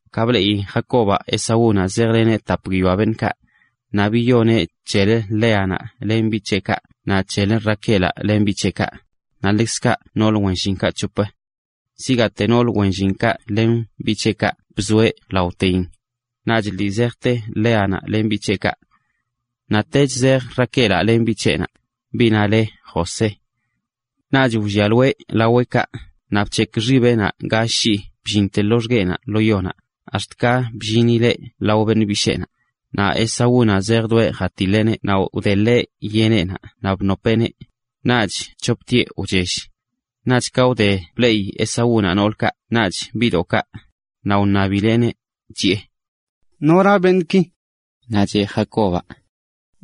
Ka bleꞌi Jacobaꞌ Esaúnaꞌ zejleneꞌ tap guiyoa beṉꞌkaꞌ, naꞌ biyoneꞌ c̱helə Léanaꞌ len biꞌ c̱heꞌkaꞌ naꞌ c̱helə Raquelaꞌ len biꞌ c̱heꞌkaꞌ, naꞌ ḻekzkaꞌ noolə wen llinkaꞌ c̱hop. Zigaate noolə wen llinkaꞌ len biꞌ c̱heꞌkaꞌ bzoeꞌ laoteyin, naꞌch lii zejte Léanaꞌ len biꞌ c̱heꞌkaꞌ. Naꞌtech zej Raquelaꞌ len biꞌ c̱heꞌnaꞌ, biꞌnaꞌ le José. Naꞌch wllialoeꞌ laweꞌkaꞌ naꞌ bc̱hekꞌ xibeꞌnaꞌ gall shii bllinte loxgueꞌnaꞌ lo yonaꞌ, ax̱t ka bllineꞌ lao beṉꞌ bisheenaꞌ. Naꞌ Esaúnaꞌ zejdoeꞌ jatiḻeꞌneꞌ naꞌ wdeḻeꞌ yeneꞌnaꞌ naꞌ bnopeꞌneꞌ. Naꞌch c̱hoptieꞌ wchell. Naꞌch ka wde bleꞌi Esaúnaꞌ noolkaꞌ naꞌch biꞌdoꞌkaꞌ, naꞌ wṉabileꞌneꞌ, chiꞌe: ―¿Nora beṉꞌki? Naꞌ cheꞌ Jacobaꞌ: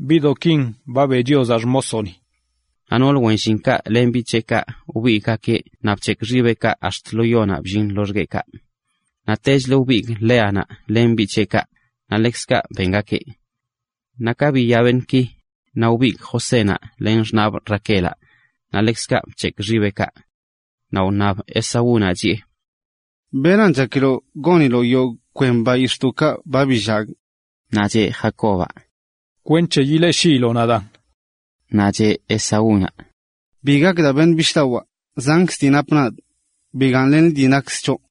―Biꞌdoꞌkin ba beꞌ Chiozaꞌ xmosoꞌni. Naꞌ noolə wen llinkaꞌ len biꞌ c̱heꞌkaꞌ wbigꞌgakeꞌ naꞌ bc̱hekꞌ xibeꞌkaꞌ ax̱t lo yonaꞌ bllin loxgueꞌkaꞌ. Naꞌtechlə wbigꞌ Léanaꞌ len biꞌ c̱heꞌkaꞌ, naꞌ ḻekzkaꞌ bengakeꞌ. Naꞌ ka biya beṉꞌki, naꞌ wbigꞌ Josénaꞌ len xṉaꞌbꞌ Raquelaꞌ, naꞌ ḻekzkaꞌ bc̱hekꞌ xibeꞌkaꞌ. Naꞌ wṉab Esaúnaꞌ, chiꞌe: ―¿Beran chakiloꞌ goniloꞌ yogꞌ kwen bayix̱ꞌdoꞌkaꞌ ba billagꞌ? Naꞌ c̱he Jacobaꞌ: ―Kwenc̱he yileꞌshiiloꞌ nadaan. Naꞌ cheꞌ Esaúnaꞌ: ―Bi gak daa, beṉꞌ bishꞌdawaa, zankzə dii napꞌ nadꞌ. Bigaaṉlen liꞌ dii nakkzə c̱hoꞌ.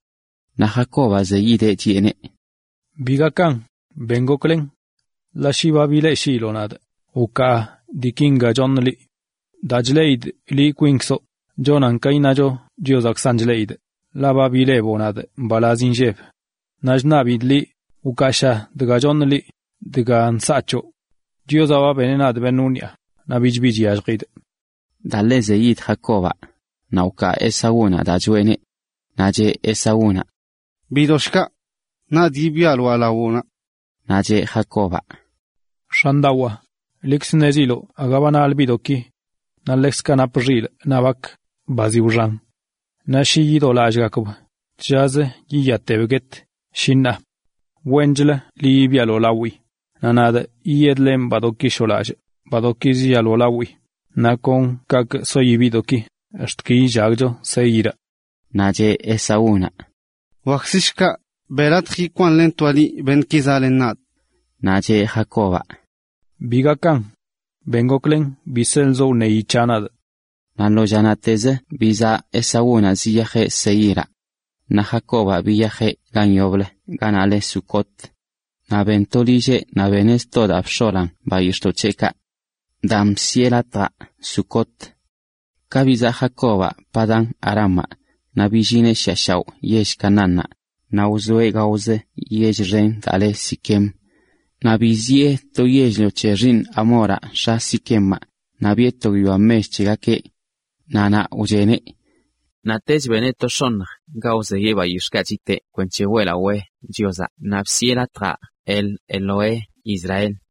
Naꞌ Jacobaꞌ zeyideꞌ, chiꞌeneꞌ: ―Bi gakan, ben goklen. Ḻaꞌ shi ba bileꞌshiiloꞌ nadꞌ, wkaa diiki choṉꞌ liꞌ. Daa chleꞌidꞌ liꞌ chonan ka iṉacho Chiozaꞌkzan chleꞌidꞌ, ḻaꞌ ba bileboꞌ nadꞌ mbalaz inlleb. Naꞌch ṉabidꞌ liꞌ, wkaasha dga choṉꞌ liꞌ, dga nsaa c̱hoꞌ. Chiozaꞌ ba beneꞌ nadꞌ beṉꞌ wniꞌa, naꞌ bich bi chyalljidꞌ. Daa ḻe wzeyid Jacobaꞌ, naꞌ wkaa Esaúnaꞌ daa choꞌeneꞌ. Naꞌ cheꞌ Esaúnaꞌ: ―Bidoꞌ shkaꞌ. Nadꞌ yibialoaꞌ lawoꞌnaꞌ. Naꞌ cheꞌ Jacobaꞌ: ―X̱andawaa, liꞌkz ṉeziloꞌ aga ba naḻ(nal) biꞌdoꞌki. Naꞌ ḻekzkaꞌ napꞌ xilꞌ naꞌ bak, ba zi wxan. Naꞌ shi yidolallꞌgakb, tllazə wiyab guet, shi ṉaa. Wenchlə yibialoꞌ lawii naꞌ nadꞌ yidlenꞌ badoꞌki shoolallꞌ kon kaꞌkꞌ sogakib naꞌ kon kaꞌkꞌ soi biꞌdoꞌki, ax̱t ki yillagcho Seíraꞌ. Naꞌ cheꞌ Esaúnaꞌ: ―Wakzə shkaꞌ, beꞌ latj yikwaaṉlentoaꞌ liꞌ beṉꞌki zaꞌlen nadꞌ. Naꞌ cheꞌ Jacobaꞌ: ―Bi gakan. Ben goklen bi seḻzoꞌ wṉeyi c̱haꞌ nadꞌ. Naꞌ lo llanaꞌtezə bizaꞌ Esaúnaꞌ ziyajeꞌ Seíraꞌ. Naꞌ Jacobaꞌ biyajeꞌ gan yoblə ganaꞌ leꞌ Sucot. Naꞌ ben to lilleꞌ naꞌ beneꞌ sto daa bx̱olan bayix̱ꞌdoꞌ c̱heꞌkaꞌ. Daan bsiꞌe latjaꞌ Sucot. Ka bizaꞌ Jacobaꞌ Padán-arámaꞌ, naꞌ billineꞌ shiꞌa shaoꞌ yell Canaánnaꞌ, naꞌ wzoeꞌ gaozə yell xen daa leꞌ Siquem. Naꞌ biziꞌe to yell-lio c̱he xiiṉ Hamoraꞌ, x̱a Siquemaꞌ, naꞌ biꞌe to guiyoa mech c̱hegakeꞌ. Naꞌ naꞌ wcheneꞌ. Naꞌtech beneꞌ to x̱oṉj ga wzeyeꞌ bayix̱ꞌkaꞌ chiteꞌ kwenc̱he weꞌlawee Chiozaꞌ naꞌ bsiꞌe latjaꞌ El-Elohe-Israel.a